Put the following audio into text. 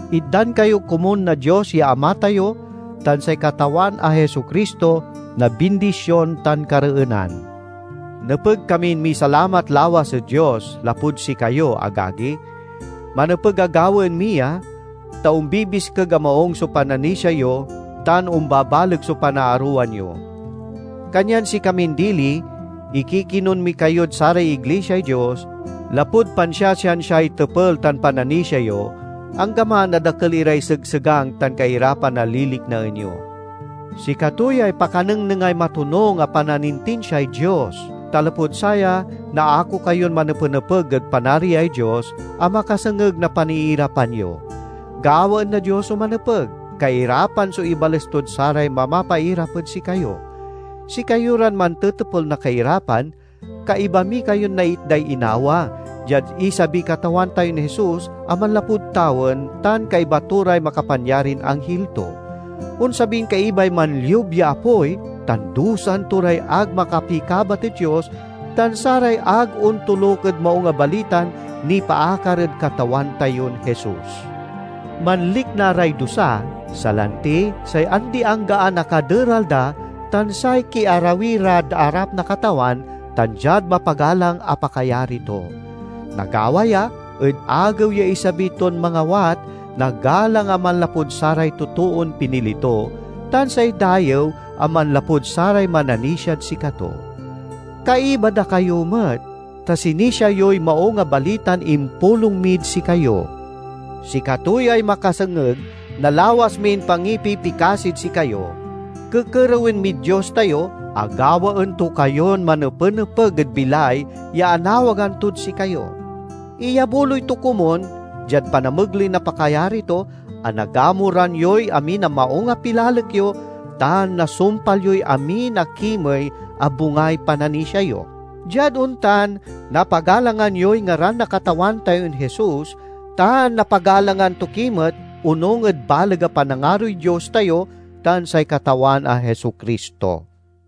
Itdan kayo komun na Dios ya Ama tayo tan say Katawan a Jesu-Cristo na bindision tan kareenan. Nepeg kamin misalamat lawas ed Dios lapud sikayo, agagi. Manepeg a gawaen mi ya, ta ombibiskeg a maung so pananisia yo tan ombabaleg so panaarowan yo. Kanyan sikamin dili ikikinun mi kayod saray iglisiay Dios, lapud pansiasiansiay tepel tan pananisia yo, anggaman a dakel iray segsegang tan kairapan a liliknaen yo. Sikato yay pakanengnengay matonung a pananintinsiay Dios, ta lapud saya naako kayon manepenepeg ed Panariay Dios, a makasengeg na paniirapan yo. Gawaen na Dios so manepeg: kairapan so ibales tod saray mamapairap ed sikayo. Sikayo ran mantetepel na kairapan, kaiba mi kayon naitday inawa, diad isabiy Katawan tayon Jesus a manlapud tawen tan kaiba to ray makapanyarin anghil to. Onsabin kaibay manliub ya apoy tan dusaen to ray ag makapikabat ed Dios tan saray ag ontoluk ed Maung a Balitan nipaakar ed Katawan tayon Jesus. Manlikna ray dusa, salanti say andi-anggaan a kaderal da tan say kiarawi rad arap na Katawan tan diad mapagalang a pakayari to. Nagawa ya ed Agew ya isabi ton mangawat na galang a manlapud saray totoon pinili to, tan say dayew a manlapud saray mananisiad sikato. Kaiba da kayo met, ta sinisia yoy Maung a Balitan impulong mid sikayo. Sikato yay makasengeg na lawas min pangipipikasid sikayo. Kekerewen mid Dios tayo a gawaen to kayon manepenepeg ed bilay ya anawagan tod sikayo. Iyabuloy to komun, diad panamegley na pakayari to, a nagamuran yoy amin a maung a pilalek yo tan nasumpal yoy amin a kimey a bungay pananisia yo. Diad ontan, napagalangan yoy ngaran na Katawan tayon Jesus, tan napagalangan to ki met onung ed baleg a panangaroy Dios tayo tan say Katawan a Jesu-Cristo.